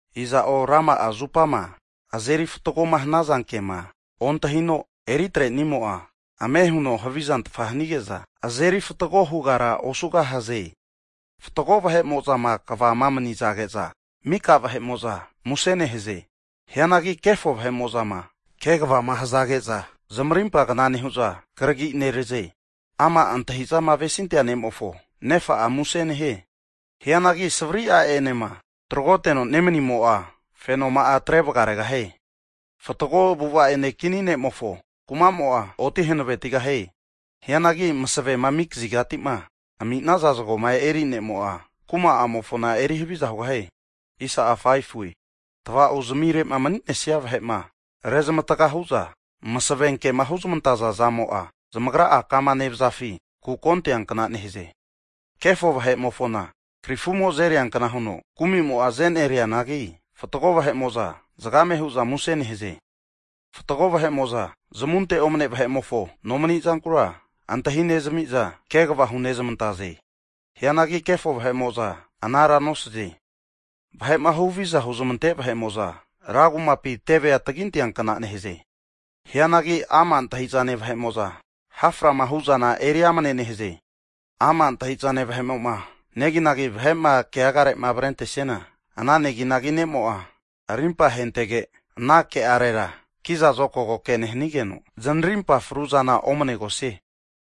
Iza'o rama'a zupama azeri fatgoma hanaza kema ontahino eritrenimo'a, ame huno havizantafa hanige'za, azeri fatgo hugara osugahaze. Fatgo vahe'mo'zama kvama manizage'za, mika vahe'mo'za muse nehaze. Hianagi kefo vahe'mo'zama kegavama hazage'za, zamarimpa kna nehu'za, kragi neraze. Ama' antahi'zama avesintea ne'mofo nefa'a muse nehie. Hianagi savri a'enema tagroteno nemanimo'a, fenoma'a atre vaganere. Fatgo avu'ava ene kini ne'mofo kuma'mo'a, oti hanavetigahie. Hianagi masavema ami kazigati'ma ami'naza zagoma eri ne'mo'a, kuma'amofona eri haviza hugahie. Tava'o zamire'ma mani'nesia vahe'ma rezmatga hu'za masave kema huzmantaza zamo'a, zamagra'a kama nevazafi kuko anteankna nehaze. Kefo vahe'mofona krifumo azeriankna huno kumimo'a azenerianagi, fatgo vahe'mo'za zagame hu'za muse nehaze. Fatgo vahe'mo'za zamunte omne vahe'mofo nomani'zankura antahi nezamiza kegava hunezmantaze. Hianagi kefo vahe'mo'za, anara nosaze. Vahe'ma huhavizama huzamante vahe'mo'za ra kumapi tevea taginteankna nehaze. Hianagi ama' antahi'zane vahe'mo'za, haframa hu'zana eri amane nehaze. Ama' antahi'zane vahe'mo'ma neginagi vahe'ma keagarema avrentesiana, ana neginagi ne'mo'a, arimpa ahentege ana ke'arera ki'za zokago ke nehanigeno zanarimpa fru'zana omanegosie.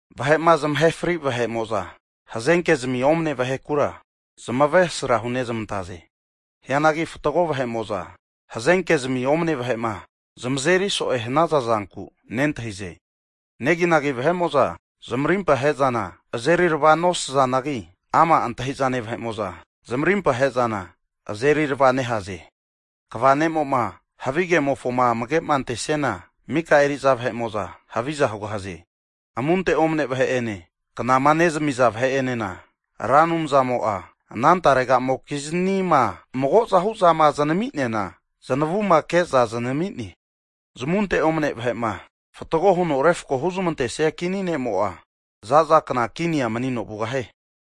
Vahe'ma zamahe fri vahe'mo'za, hazenkezmi omane vahekura zamavesra hunezmantaze. Hianagi fatgo vahe'mo'za, hazenkezmi omane vahe'ma zamazeri so'ema hanaza zanku nentahize. Neginagi vahe'mo'za zamarimpa he'zana azerirava nosazanagi, ama' antahi'zane vahe'mo'za, zamarimpa ahe'zana azerirava nehaze. Kva ne'mo'ma havigemofoma amage'ma antesiana, mika eri'za vahe'amo'za haviza hugahaze. Amunte omane vahe'ene, knama nezamiza vahe'enena, Ra Anumzamo'a ana taregamokiznima magozahu'zama, zanami'neana zanavuma ke'za zanamine. Zamunte omne vahe'ma fatgo huno refakoma huzmantesia kini ne'mo'a, za'za kna kinia manino vugahie.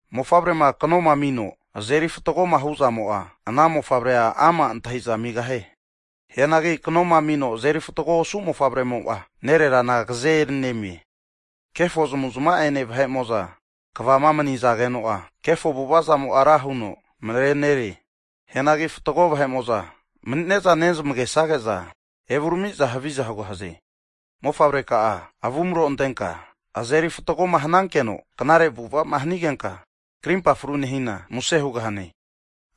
Mofavrema kanoma amino azeri fatgoma hu'zamo'a, ana mofavrea ama' antahi'za amigahie. Hianagi kanoma amino azeri fatgo osu mofavremo'a, nererana agaze eri nemie. Kefo zamavu'zmava'ene vahe'mo'za kvama manizageno'a, kefo avu'ava zamo'a ra huno marenerie. Hianagi fatgo vahe'mo'za mani'ne'za nezamagesage'za evurami'za haviza hugahaze. Mofavreka'a avumro antenka, azeri fatgoma hanankeno knare avu'ava'ma hanigenka, karimpa fru nehina muse hugahane.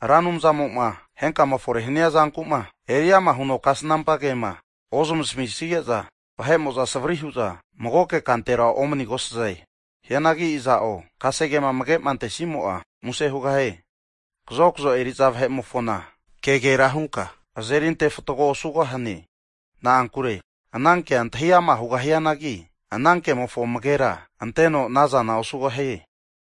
Ra Anumzamo'ma henkama fore'ma hania zanku'ma, eri ama huno kasnampa kema ozamasmisige'za, vahe'mo'za savri hu'za magoke kantera omanigosaze. Hianagi iza'o kasegema amage'ma antesimo'a, muse hugahie. Kazokzo eri'za vahe'mofona kegera hunka azeri antefatgo osugahane. Na'ankure ana kea antahi ama' hugahianagi, ana kemofona amagera anteno anazana osugahie.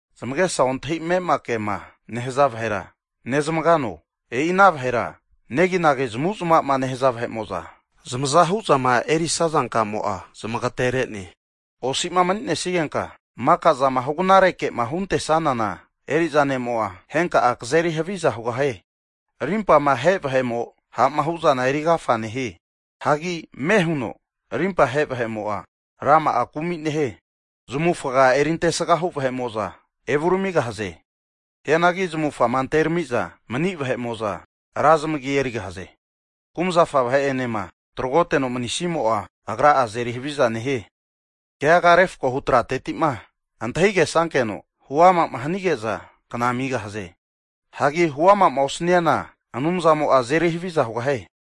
Zamagesa ontahi ame'ama kema nehaza vahera nezamagano? E'i ana vahera neginagi zamavu'zamava'ma nehaza vahe'mo'za zamaza hu'zama erisaza kamo'a zamagetere'ne. Osi'ma mani'nesigenka maka'zama hugnareke'ma hunte'nesana eri'za ne'mo'a, henka'a kazeri haviza hugahie. Arimpama ahe vahemo ha'ma hu'zana eri agafa nehie. Hagi ame huno rimpa ahe vahe'mo'a, rama'a kumi nehie. Zamavufga eri antesga hu vahe'mo'za evuramigahaze. Hianagi zamavufagama anteramiza mani vahe'mo'za, ra zamagi erigahaze. Kumzafa vahe'enema tragoteno manisimo'a, agra'a azeri haviza nehie. Keaga refakohu tratetima antahigesankeno huama'ma hanige'za kana amigahaze. Hagi huamama osniana, Anumzamo'a azeri haviza hugahie.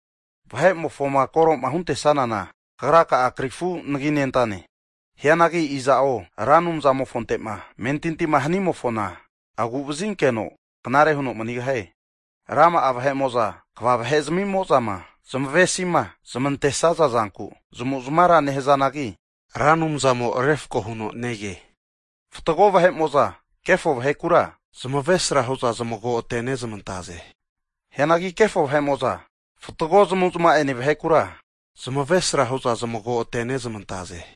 Vahe'mofoma koroma huntesanana, kagra'a krifu anaginentane. Hianagi iza'o Ra Anumzamofonte'ma amentintima hanimofona, agu'vazinkeno knare huno manigahie. Rama'a vahe'mo'za kva vahe zamimozama zamavesima zamantesaza zanku zamavu'zmavara nehazanagi, Ra Anumzamo refako huno nege. Fatgo vahe'mo'za kefo vahekura zamavesra hu'za zamago atenezmantaze. Hianagi kefo vahe'mo'za fatgo zmavuzmava'ene vahekura, zamavesra hu'za zamago'atenezmantaze.